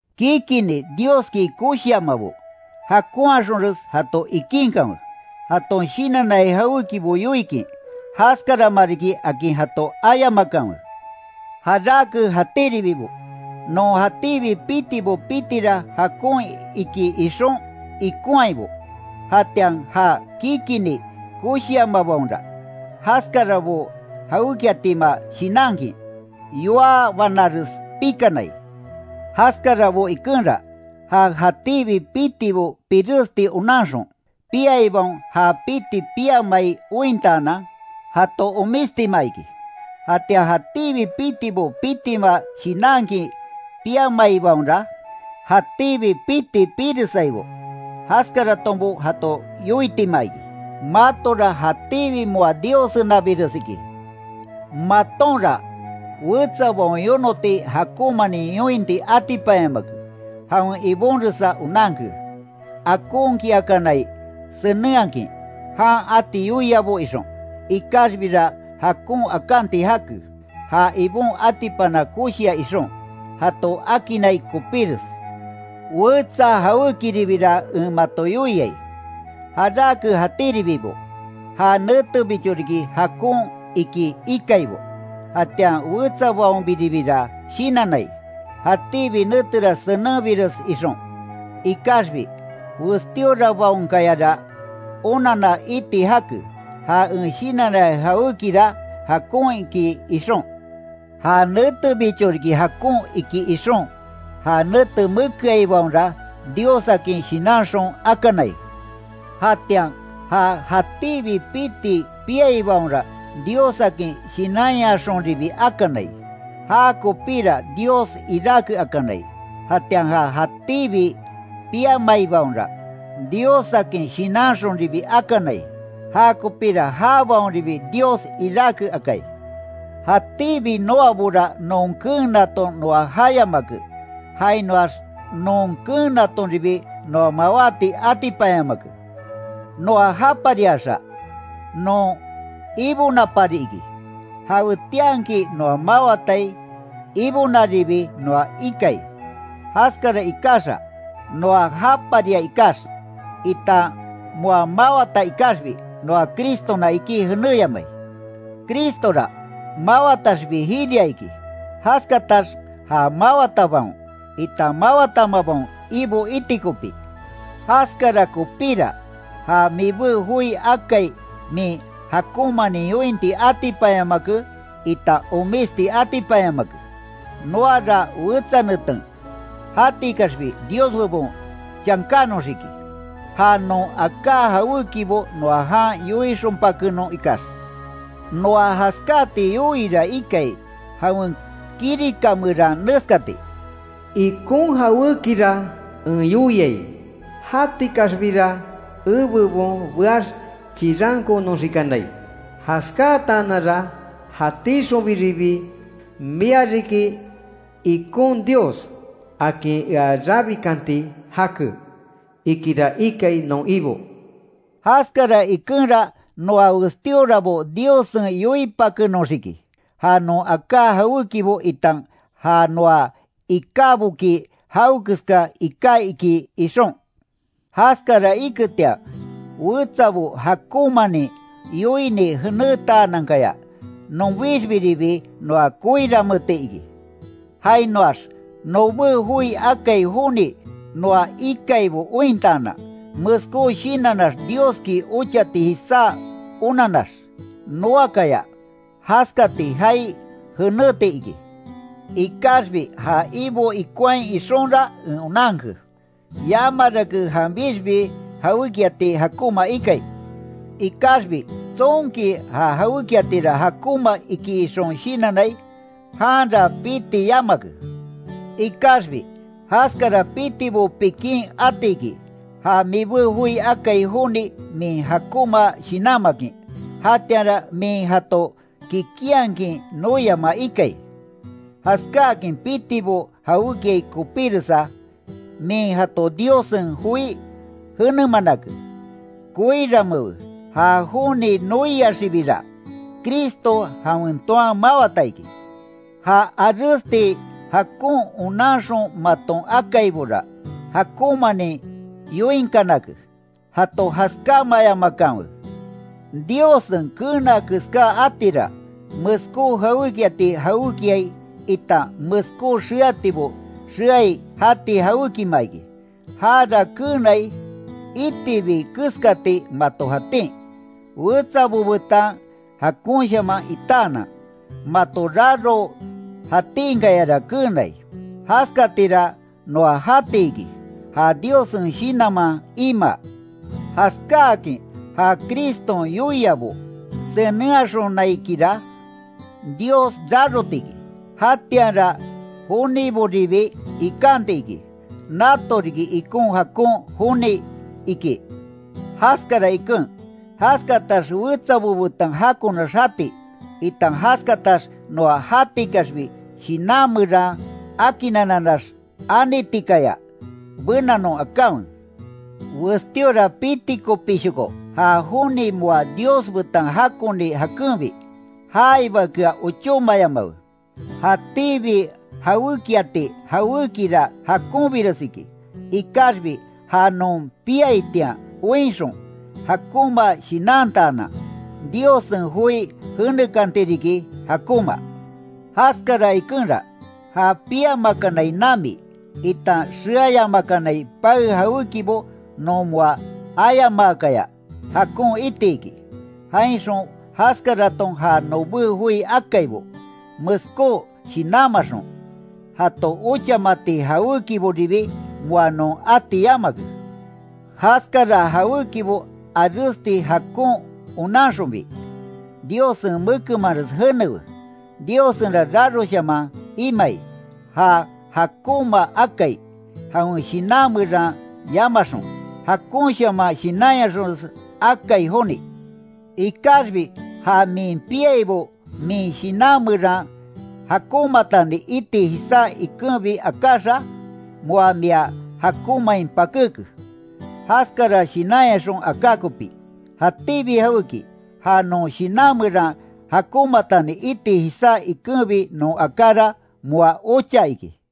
Kikinni Dioski koshiamabo, jakonhaxonres jato ikinkanwe. Jaton shinannai jawékibo yoikin, jaskarama riki akin jato ayamakanwe. Jarake jatíribibo, non jatíbi pitibo pitira jakon iki ixon ikonhaibo; jatian ja kikinni koshiamabaonra, jaskarabo jawékiatima shinankin, yoá banares pikanai. Jaskarabo ikenra, ja jatíbi pitibo piresti onanxon, piaibaon ja piti piamai ointaanan, jato omistima iki. Jatian jatíbi pitibo pitima shinankin piamaibaonra, jatíbi piti piresaibo, jaskaratonbo jato yoitima iki. Matora jatíbi moa Diossenabires iki. Matonra wetsabaon yonoti jakonmanin yointi atipanyamake, jawen ibonresa onanke, akonkiakanai senenhakin, jan ati yoiabo ixon. Ikaxbira jakon akanti jake, ja Ibon atipana koshia ixon, jato akinnai kopíres. Wetsa jawékiribira en mato yoiai: Jarake jatíribibo, ja netebicho riki jakon iki, ikaibo; jatian wetsabaonbiribira shinannai, jatíbi netera senenbires ixon. Ikaxbi, Westíorabaonkayara onanna iti jake, ja en shinannai jawékira jakon iki, ixon. Ja netebicho riki jakon iki ixon, ja nete mekeaibaonra, Diossakin shinanxon akanai; jatian ja jatíbi piti piaibaonra Diossakin shinanyaxonribi akanai, jakopira Dios iráke akanai; jatian ja jatíbi piamaibaonra, Diossakin shinanxonribi akanai, jakopira jabaonribi Dios iráke akai. Jatíbi noabora non keenaton noa jayamake, jainoax non keenatonribi noa mawáti atipanyamake. Noa japariaxa, non Ibonapari iki, jawetianki noa mawatai Ibonaribi noa ikai. Jaskara ikaxa, noa japaria ikax, itan moa mawata ikaxbi, noa Cristona iki jeneyamai. Cristora, mawataxbi jiria iki, jaskatax ja mawatabaon, itan mawatamabaon Ibo iti kopí. Jaskara kopíra, ja mibé joi akai min jakonmanin yointi atipanyamake itan omisti atipanyamake. Noara wetsa neten, jatikaxbi Dios bebon chankánoxiki, ja non aká jawékibo noa jan yoixonpakenon ikax. Noa jaskati yoiira ikai, jawen kirika meran neskati: “Ikon jawékira en yoiai; jatikaxbira ebebon beax, chirankoonoxikanai, jaskataananra jatixonbiribi, mia riki ikon Dios, akin ea rabikanti jake ikira ikai, non Ibo”. Jaskara ikenra noa westíorabo Diossen yoipakenoxiki, ja non aká jawékibo itan ja noa ikáboki jawekeska iká iki, ixon. Jaskara iketian wetsabo jakonmanin yoini jenétanankaya, nonbixbiribi noa koiranmeeti iki. Jainoax nobé joi akai joni noa ikaibo ointaanan, meskó shinannax Dioski ochati jisá onannax, noakaya jaskati jaai jeneti iki. Ikaxbi ja Ibo ikonhai ixonra en onanke, yamarake janbixbi jawékiati jakonma ikai. Ikaxbi tsonki ja jawékiatira jakonma iki ixon shinannai, janra piti yamake. Ikaxbi, jaskara pitibo pikin atiki, ja mibé joi akai joni min jakonma shinanmakin, jatianra min jato kikinhakin noiama ikai. Jaskáakin pitibo jawékiai kopíresa, min jato Diossen joi jenemanake, koiranmeewe; ja joni noiaxibira, Cristo jawen toan mawata iki. Ja aresti jakon onanxon maton akaibora, jakonmanin yoinkanake, jato jaskáamayamakanwe. Diossen keena keská atira, meskó jawékiati jawékiai itan meskó xeatibo xeai jati jawékima iki; jara keenai, itibi keskati mato jatin, wetsabo betan jakonshaman itaanan, mato raro jatinkayara keenai. Jaskatira noa jati iki, ja Diossen Shinanman imaa. Jaskáakin ja Criston yoiabo senenhaxonaikira, Dios raroti iki. Jatianra joniboribi ikanti iki, nato riki ikon jakon joni, iki. Jaskara iken, jaskatax wetsabo betan jakonax jati, itan jaskatax noa jatikaxbi shinan meran akinnananax anitikaya, benanon akanwe. Westíora piti kopíshoko ja joni moa Dios-betan jakoni jakenbi, jaibakea ochómayamawe. Jatíbi jawékiati jawékira jakonbires iki; Ikaxbi ja non piaitian oinxon, jakonma shinantaanan, Diossen joi jenekanti riki, jakonma. Jaskara ikenra, ja piamakanai nami, itan xeayamakanai pae jawékibo non moa ayamaakaya, jakon iti iki; jainxon jaskaraton ja nobé joi akaibo, meskó shinanmaxon, jato ochamati jawékiboribi moa non ati yamake. Jaskara jawékibo aresti jakon onanxonbi, Diossen mekenmanres jénewe. Diossenra raroshaman imai, ja jakonma akai, jawen shinan meran yamaxon, jakonshaman shinanyaxonres akai joni. Ikaxbi ja min piaibo min shinan meran jakonmatani iti jisá ikenbi akáxa, moa mia jakonmain pakéke, jaskara shinanyaxon aka kopí. Jatíbi jawéki, ja non shinan meran jakonmatani iti jisá ikenbi non akára moa ocha iki.